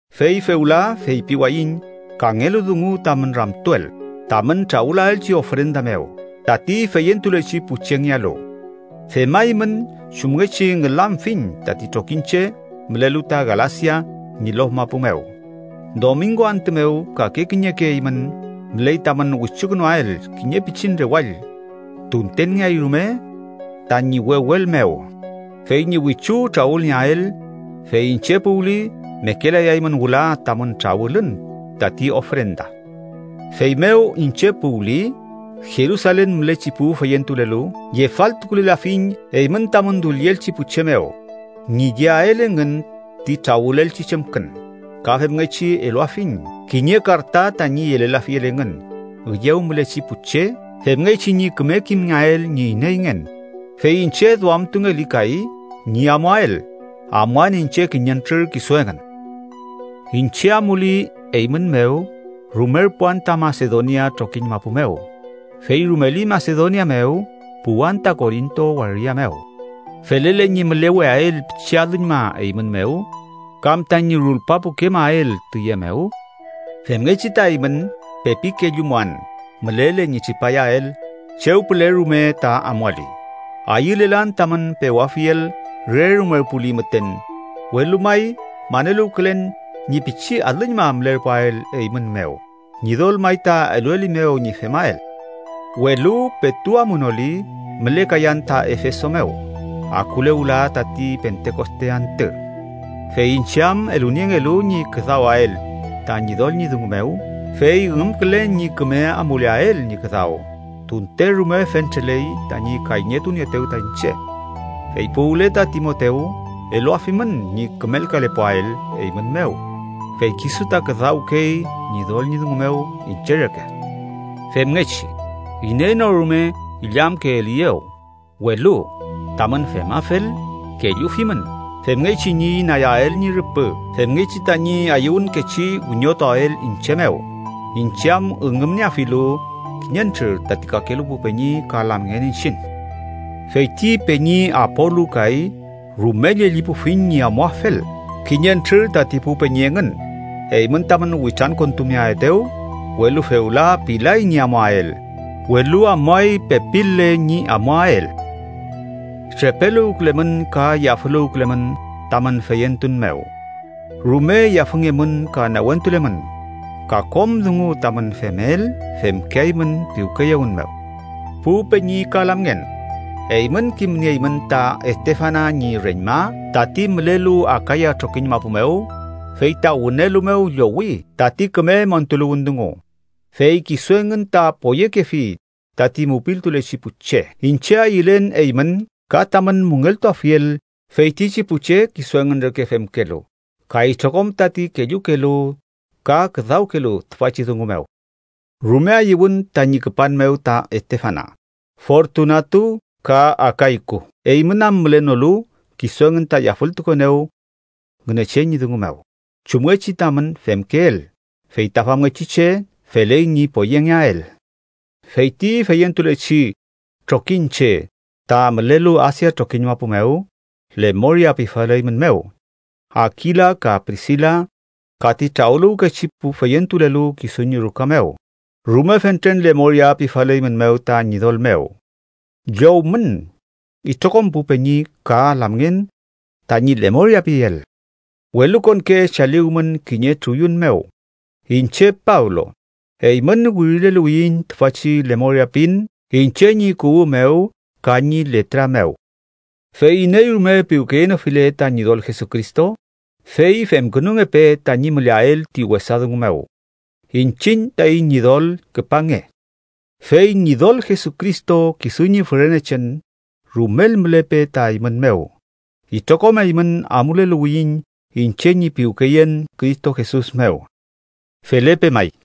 Fey fewla feypiwayiñ kangelu dungu tamün ramtuel tamün trawülaelchi ofrenda mew tati feyentulechi pu chengealu, femaymün chumngechi ngülamfiñ tati trokiñche mülelu ta Galasia ñi lof mapu mew. Domingo antü mew, kake kiñeke eymün müley tamün wichukünuael kiñe pichin rewall, tuntenngeay rume tañi wewel mew, fey ñi wichu trawülnieael, fey iñche puwli mekelayaymün wüla tamün trawülün tati ofrenda. Feymew iñche puwli, Jerusalen mülechi pu feyentulelu yefaltukulelafiñ eymün tamün dullielchi pu che mew ñi yeael engün ti trawülelchi chemkün, ka femngechi eluafiñ kiñe karta tañi yelelafiel engün üyew mülechi pu che femngechi ñi küme kimngeael ñi ineyngen. Fey iñche duamtungeli kay ñi amuael, amuan iñche kiñentrür kisu engün. Iñche amuli eymün mew, rumerpuan ta Masedonia trokiñ mapu mew, fey rumeli Masedonia mew puwan ta Korinto waria mew. Felele ñi müleweael pichi alüñma eymün mew, kam tañi rulpapukemael tüye mew. Femngechi ta eymün pepi kellumuan mülele ñi tripayael chew püle rume ta amuali. Ayülelan tamün pewafiel re rumerpuli müten, welu may maneluwkülen ñi pichi alüñma mülerpuael eymün mew, Ñidol may ta eluelimew ñi femael. Welu petu amunoli, mülekayan ta Efeso mew akule wüla tati Pentekoste antü, fey iñche am eluniengelu ñi küdawael ta Ñidol ñi dungu mew fey üngümkülen ñi küme amuleael ñi küdaw, tunte rume fentreley tañi kayñetunieetew ta iñche. Fey puwle ta Timotew, eluafimün ñi kümelkalepuael eymün mew, fey kisu ta küdawkey Ñidol ñi dungu mew iñche reke. Femngechi, iney no rume illamkeeliyew. Welu tamün femafel, kellufimün femngechi ñi inayael ñi rüpü femngechi tañi ayüwünkechi wiñotuael iñche mew, iñche am üngümnieafilu kiñentrür tati kakelu pu peñi ka lamngen iñchiñ. Fey ti peñi Apolu kay rume llellipufiñ ñi amuafel kiñentrür tati pu peñi engün, eymün tamün witrankontumeaetew, welu fewla pilay ñi amuael. Welu amuay, pepil-le ñi amuael. Trepeluwkülemün ka yafüluwkülemün tamün feyentun mew. Rume yafüngemün ka newentulemün. Ka kom dungu tamün femel, femkeaymün piwkeyewün mew. Pu peñi ka lamngen, eymün kimnieymün ta Estefana ñi reñma tati mülelu Akaya trokiñ mapu mew, fey ta wünelu mew llowi tati küme montuluwün dungu, fey kisu engün ta poyekefi tati mupiltulechi pu che. Iñche ayülen eymün ka tamün müngeltuafiel feytichi pu che kisu engün reke femkelu ka itrokom tati kellukelu ka küdawkelu tüfachi dungu mew. Rume ayüwün tañi küpan mew ta Estefana, Fortunatu, ka Akayku. Eymün am mülenolu, kisu engün ta yafültukuenew Ngünechen ñi dungu mew, chumngechi tamün femkeel. Fey ta famngechi che, feley ñi poyengeael. Fey ti feyentulechi trokiñche ta mülelu Asia trokiñ mapu mew, lemoria pifaleymünmew. Akila ka Prisila, ka ti trawüluwkechi pu feyentulelu kisu ñi ruka mew, rume fentren lemoria pifaleymünmew ta Ñidol mew. Llowmün itrokom pu peñi ka lamngen tañi lemoria piel. Welukonke chaliwmün kiñe truyun mew. Iñche Pablo, eymün wirileluwiyiñ tüfachi lemoria pin iñche ñi kuwü mew ka ñi letra mew. Fey iney rume piwkeyenofile ta Ñidol Jesucristo, fey femkünungepe tañi müleael ti wesa dungu mew. ¡Iñchiñ taiñ Ñidol, küpange! Fey Ñidol Jesucristo kisu ñi fürenechen rumel mülepe ta eymün mew. Itrokom eymün amuleluwiyiñ iñche ñi piwkeyen Cristo Jesus mew. Felepe may.